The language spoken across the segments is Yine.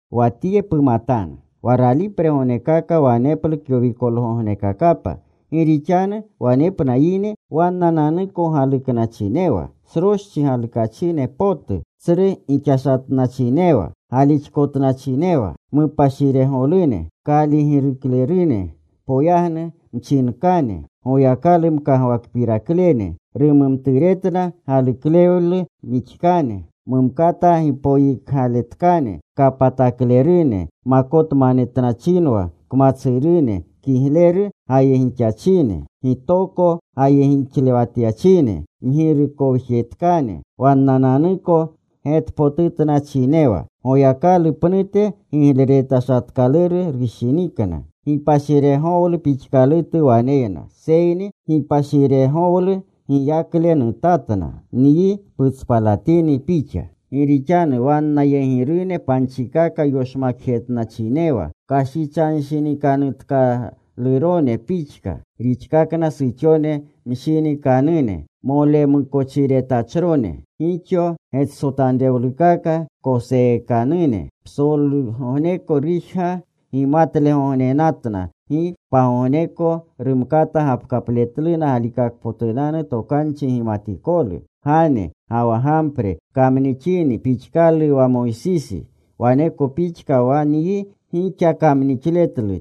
Wa tye pumatanu. Wa ralipregognekaka waneplu kyowikolgognekakapa. Gi rixanu wanepna yine wannananuko galuknachinewa, sroschi galukachine potu, tsru gixashatnachinewa, galixkotnachinewa, mupashiregolune, kaaligiruklerune, poyagnu mchinkane, Goyakalu mkagwakpiraklene, rumumturetna galuklewle mixkane, mumkata gipoyikgaletkane, kapataklerune, makotmanetnachinwa kmatsurune, kigleru gayegixachine, gitokoko gayegixlewatyachine, mgirukowjetkane, wannananuko getpotutnachinewa. Goyakalu pnute gigleretashatkaluru rushinikna. Gipashiregowlu pixkalutu waneyna, seyni gipashiregowlu giyakle nutatna. Nyi putspalatini pixa. Gi rixanu wannayegirune panchikaka yoshmakjetnachinewa. Kashichanshinikanutkalurone pixka rixkana suxone mshinikanune molemukochiretachrone, gixo getsotanrewlukaka koseekanune. Psolgogneko rujga gimatlegognenatna. Gi pagogneko rumkata gapkapletluna galikakpotunanu tokanchi gimatikolu. Gane ga wa Gampre kamnixini pixkalu wa Mosisi, waneko pixka wa nyi gixa kamnixletlu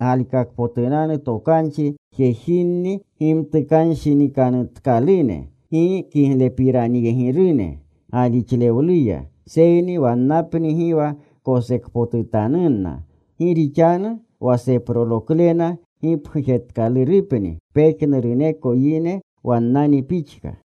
galikakpotunanu tokanchi. Jejinni gimtukanshinikanutkalune. Gi kiglepiranyegirunni galixlewluya. Seyni wannapni gi wa kosekpotutanunna. Gi rixanu wa seproloklena gipgujetkalurupni pejnuruneko yegi, wannani pixka.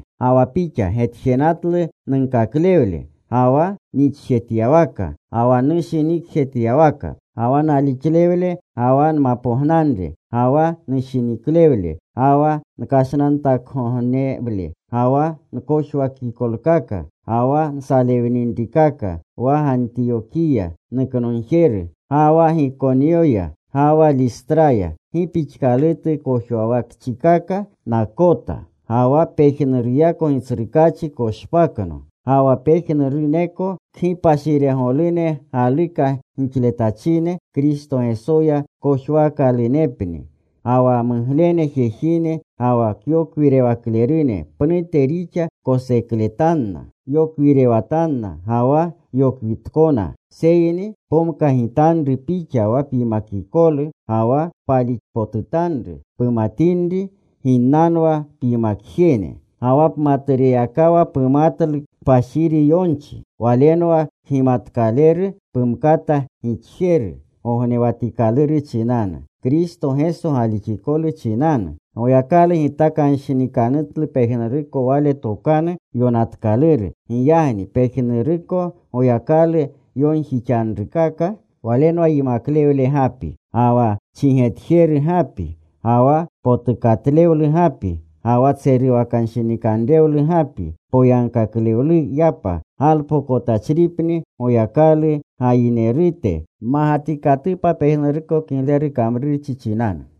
Ga wa pixa getjenatlu nunkaklewle, ga wa nixjetyawaka, ga wa nushinikjetyawaka, ga wa nalixlewle, ga wa nmapognanre ga wa nushiniklewle, ga wa nkashnantakgognewle, ga wa nkojwakikolkaka, ga wa nsalewninrikaka, wa Gantiyokiya nuknogjeru, ga wa Gikonyoya, ga wa Listraya, gi pixkalutu kojwawakchikaka nakota. Ga wa pejnuruyako Gitsrukaachi koshpakno. Ga wa pejnuruneko kgipashiregolune galuka gixletachine Kristo Gesoya kojwaakalunepni. Ga wa muglene jejine ga wa kyokwirewaklerune pnute rixa kosekletanna. Yokwirewatanna ga wa yokwitkona. Seyni pomkagitanru pixa wa pyimakikolu ga wa palixpotutanru, pumatinri ginnanwa pyimakjene. Ga wa pmatureyakawa pumatlu kpashiri yonchi. Walenwa kgimatkaleru pumkata gixjeru gognewatikaluru chinanu, Kristo Geso galixikolu chinanu. Goyakalu gitakanshinikanutlu pejnuruko Wale Tokanu Yonatkaluru. Giyagni pejnuruko Goyakalu yonjixanrukaka walenwa yimaklewle gapi, ga wa chigetjeru gapi, ga wa potukatlewlu gapi, ga wa tseruwakanshinikanrewlu gapi poyagkaklewluyapa, galpokotachripni Goyakalu gayinerute. Mmagatikatupa pejnuruko kigleru kamrurchi chinanu.